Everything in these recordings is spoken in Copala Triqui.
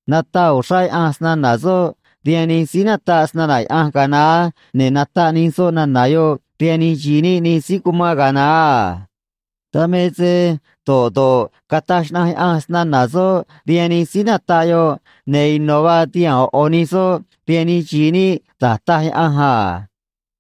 Nataꞌ uxrá Yaꞌanj snana̱ soꞌ rihaan nij síí nataꞌ snana̱ Yaꞌanj ga̱a naá, ne̱ nataꞌ nij soꞌ nana̱ yoꞌ rihaan nij xi̱i níꞌ nij síí cumán ga̱a naá a. Dan me se do̱ꞌ do̱ꞌ cataj xnaꞌanj Yaꞌanj snana̱ soꞌ rihaan nij síí nataꞌ yoꞌ, ne̱ ino̱ vaa tihaa̱n ꞌo̱ ꞌo̱ nij soꞌ rihaan nij xi̱i níꞌ da̱j taj Yaꞌanj a.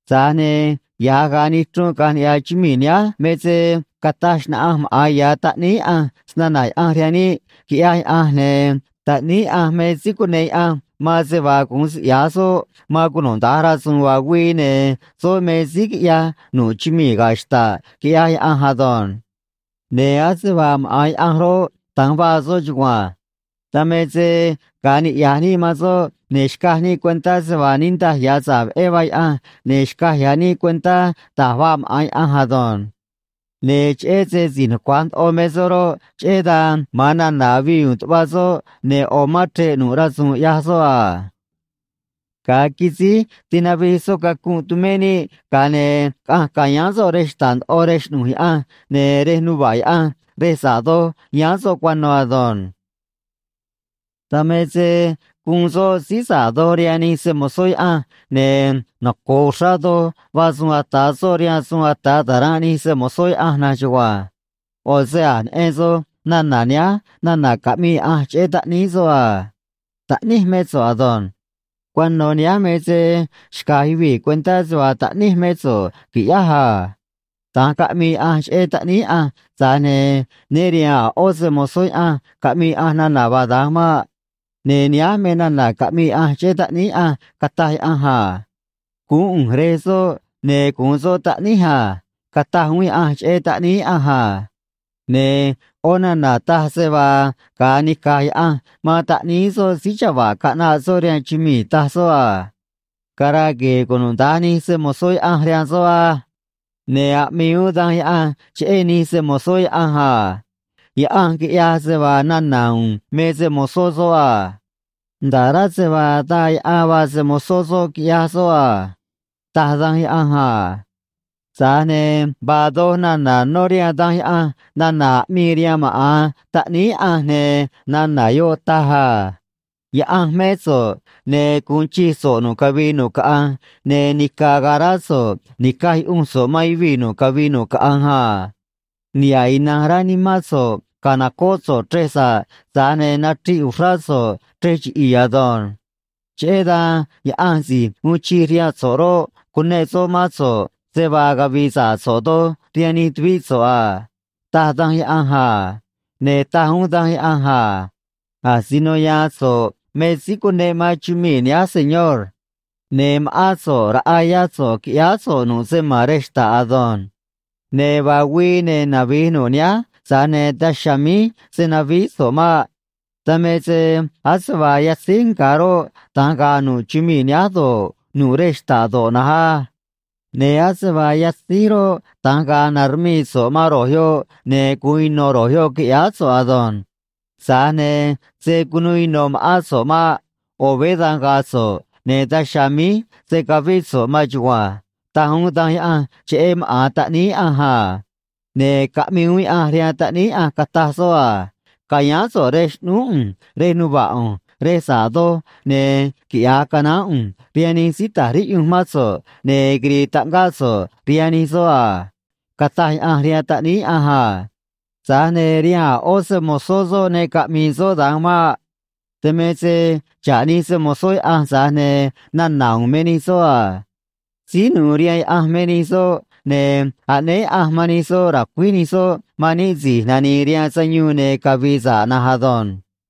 Tza̱j ne̱ ya̱j ga̱a nichrunꞌ caꞌa̱nj niꞌya̱ chumii̱ nihánj me se cataj xnaꞌanj maꞌa̱n ya̱ Taꞌníí Yaꞌanj snana̱ Yaꞌanj rihaan níꞌ, quiꞌyaj Yaꞌanj, ne̱ Taꞌníí Yaꞌanj me síí cuneꞌ Yaꞌanj man se vaa gu̱un siꞌya̱j soꞌ man cunuda̱nj rasu̱u̱n vaa güii, ne̱ soꞌ me síí quiꞌyaj nu̱ꞌ chumii̱ ga̱ xta̱ꞌ, quiꞌyaj Yaꞌanj ado̱nj. Ne̱ ase vaa maꞌa̱n Yaꞌanj roꞌ, da̱nj vaa soꞌ chugua̱nj. Dan me se ga̱a niꞌya̱j níꞌ man soꞌ, ne̱ xcaj níꞌ cuentá se vaa niꞌndaj ya̱ sa̱ꞌ veꞌé vaa Yaꞌanj, ne̱ xcaj ya̱ níꞌ cuentá da̱j vaa maꞌa̱n Yaꞌanj ado̱nj. Ne̱ cheꞌé se si̱j nucua̱j ndoꞌo me soꞌ roꞌ, cheꞌé dan ma̱an nana̱ avii u̱u̱n tuꞌva soꞌ, ne̱ ꞌo̱ mán chre̱ꞌ nu̱ꞌ rasu̱u̱n ꞌyaj soꞌ a. Ga̱a quisíj tinavij soꞌ cacunꞌ tumé níꞌ, ga̱a ne̱ caꞌanj ca̱yáán soꞌ rej xta̱ꞌ ndoꞌo rej xꞌnu̱j Yaꞌanj, ne̱ rej nuva̱ꞌ Yaꞌanj rej sa̱ꞌ doj yáán soꞌ cuano̱ ado̱nj. Dan me se guun soꞌ síí sa̱ꞌ doj rihaan nij se‑mo̱zó Yaꞌanj, ne̱ noco̱o uxrá doj vaa suun ata̱ soꞌ rihaan suun ata̱ ta̱ranꞌ nij se‑mo̱zó Yaꞌanj na̱nj chugua̱nj. ꞌO̱ se a̱j neꞌen soj nana̱ nihánj nana̱ caꞌmii Yaꞌanj cheꞌé Taꞌníí soꞌ a: Taꞌníj mé so̱ꞌ ado̱nj. Cuano̱ nihánj me se xca̱j yuvii̱ cuentá se vaa Taꞌníj mé so̱ꞌ, qui̱ꞌyáj a. Da̱nj caꞌmii Yaꞌanj cheꞌé Taꞌníí Yaꞌanj, tza̱j ne̱ né riha̱a̱n a̱ ꞌó se‑mo̱zó Yaꞌanj caꞌmii Yaꞌanj nana̱ vaa da̱nj maꞌ. Ne̱ nihánj me nana̱ caꞌmii Yaꞌanj cheꞌé Taꞌníí Yaꞌanj, cataj Yaꞌanj a: Guún ꞌu̱nj Rej soꞌ, ne̱ gu̱un soꞌ Taꞌníj a, cataj uún Yaꞌanj cheꞌé Taꞌníí Yaꞌanj a. Ne̱ ꞌó nana̱ taj se vaa, ga̱a nica̱j Yaꞌanj man Taꞌníí soꞌ síí chava̱ꞌ caꞌnaꞌ soꞌ rihaan chumii̱, taj soꞌ a: Cara̱a̱ gue̱e̱ cunuda̱nj nij se‑mo̱zó Yaꞌanj rihaan soꞌ á. Ne̱ aꞌmii uún Danj Yaꞌanj cheꞌé nij se‑mo̱zó Yaꞌanj a: Yaꞌanj quiꞌyaj se vaa nana̱ u̱u̱n me se-mo̱zó soꞌ a. Nda̱ꞌ rá se vaa daa yaꞌan vaa se-mo̱zó soꞌ quiꞌyaj soꞌ a, taj Danj Yaꞌanj a. Tza̱j ne̱ vaa doj nana̱ nó rihaan Danj Yaꞌanj nana̱ aꞌmii rihaan maꞌa̱n Taꞌníí Yaꞌanj, ne̱ nana̱ yoꞌ taj a: Yaꞌanj mé so̱ꞌ, ne̱ gu̱un chij so̱ꞌ nu̱ꞌ cavii nu̱ꞌ caꞌanj, ne̱ nica̱ ga̱a̱ rá so̱ꞌ ni̱caj yuꞌunj so̱ꞌ man yuvii̱ nu̱ꞌ cavii nu̱ꞌ caꞌanj a. Niha̱ꞌ ina̱nj rá nimán so̱ꞌ ca̱nocóꞌ so̱ꞌ chrej sa̱ꞌ, tza̱j ne̱ nachriꞌ uxrá so̱ꞌ chrej chiꞌi̱i̱ ado̱nj. Cheꞌé dan Yaꞌanj si̱j uun chij rihaan so̱ꞌ roꞌ, cuneꞌ soꞌ mán so̱ꞌ, se vaa cavi̱i̱ sa̱ꞌ so̱ꞌ doj rihaan nij tuvíꞌ so̱ꞌ a, taj Danj Yaꞌanj a. Ne̱ taj uún Danj Yaꞌanj a: Asino ya̱a̱n so̱ꞌ me síí cuneꞌ man chumii̱ nihánj, Señor. Ne̱ ma̱ꞌán so̱ꞌ raꞌa yá so̱ꞌ quiꞌyáá so̱ꞌ nu̱ꞌ se ma̱n rej xta̱ꞌ ado̱nj. Ne̱ vaa güii, ne̱ navi̱j nu̱ꞌ nihánj, tza̱j ne̱ daj chiha̱a̱ míj se̱ navíí so̱ꞌ maꞌ. Dan me se ase vaa yatzíj nga̱ roꞌ, da̱nj ga̱a̱ nu̱ꞌ chumii̱ nihánj do̱ꞌ, nu̱ꞌ rej xta̱ꞌ do̱ꞌ na̱nj á. Ne̱ ase vaa yatzíj roꞌ, da̱nj ga̱a̱ na̱rmii so̱ꞌ man ro̱j yoꞌ, ne̱ gu̱un ino̱ ro̱j yoꞌ, qui̱ꞌyáá so̱ꞌ ado̱nj. Tza̱j ne̱ se̱ cunuu ino̱ ma̱ꞌán so̱ꞌ maꞌ. ꞌO̱ veé da̱nj ga̱a̱ so̱ꞌ, ne̱ daj chiha̱a̱ míj se̱ cavíꞌ so̱ꞌ maan chugua̱nj, taj uún Danj Yaꞌanj cheꞌé maꞌa̱n Taꞌníí Yaꞌanj a. Ne̱ caꞌmii uún Yaꞌanj rihaan Taꞌníí Yaꞌanj, cataj soꞌ a: Ca̱yáán so̱ꞌ rej xꞌnúú ꞌu̱nj rej nuva̱ꞌ ꞌu̱nj rej sa̱ꞌ doj, ne̱ quiꞌya̱j canaán ꞌu̱nj rihaan nij síí ta̱j riꞌyunj mán so̱ꞌ, ne̱ quiri̱i̱ taꞌngáꞌ so̱ꞌ rihaan nij soꞌ a, cataj Yaꞌanj rihaan Taꞌníí Yaꞌanj a. Tza̱j ne̱ rihaan a̱ ꞌó se‑mo̱zó soꞌ ne caꞌmi̱i̱ soꞌ da̱nj maꞌ. Dan me se xa̱ꞌ nij se‑mo̱zó Yaꞌanj, tza̱j ne̱ nana̱ u̱u̱n me nij soꞌ a. Síí nu̱u̱ rihaan Yaꞌanj me nij soꞌ, ne̱ aꞌnéé Yaꞌanj man nij soꞌ ra̱cuíj nij soꞌ man níꞌ si̱j nani̱i̱ rihaan sayuun ne̱ cavi̱i̱ sa̱ꞌ na̱nj ado̱nj.